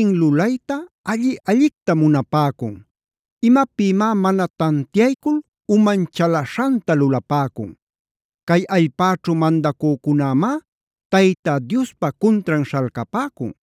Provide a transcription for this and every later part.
lulayta alli-allicta munapäcun? ¿Imapïmá mana tantiaycul uman chalaśhanta lulapäcun? Cay allpäćhu mandacücunämá Tayta Diospa cuntran śhalcapäcun.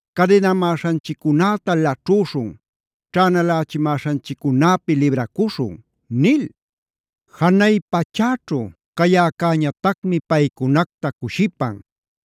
“Cadinamäśhanchiccunäta laćhüśhun. Ćhänalächimäśhanchiccunäpi libracuśhun” nil. Janay pachäćhu cayäcäñatacmi paycunacta cushipan.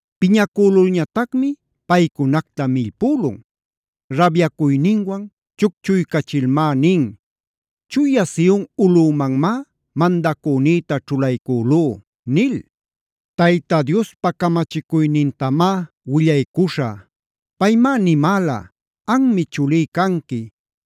Piñacülulñatacmi paycunacta millpülun. Rabyacuyninwan chucchuycachilmá nin: “Chuya Sion ulꞌümanmá mandacünïta ćhulaycülú” nil. Tayta Diospa camachicuynintamá willaycuśhä. Paymá nimäla: “Anmi chulí canqui.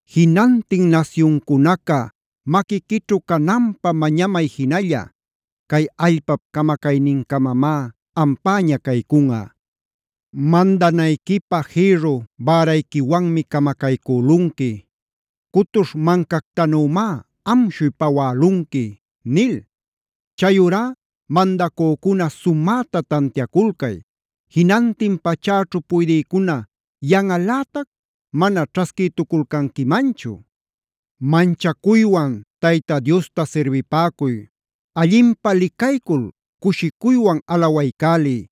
Jinantin nasyuncunaca maquiquićhu cananpä mañamay jinalla. Cay allpap camacaynincamamá ampäña caycunꞌa. Mandanayquipä jïrru bärayquiwanmi camacaycülunqui.d Cutuśh mancactanümá amshuy pawälunqui” nil. Chayurá mandacücuna sumäta tantiaculcay. Jinantin pachäćhu puydïcuna yanꞌalätac mana ćhasquïtuculcanquimanchu. Manchacuywan Tayta Diosta sirbipäcuy. Allinpä licaycul cushicuywan alawaycäliy.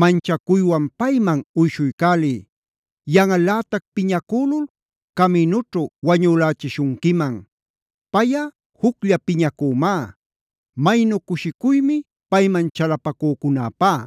Manchacuywan payman uyshuycäliy. Yanꞌalätac piñacülul caminućhu wañülächishunquiman. Payꞌa juclla piñacümá. ¡Maynu cushicuymi payman chalapacücunäpá!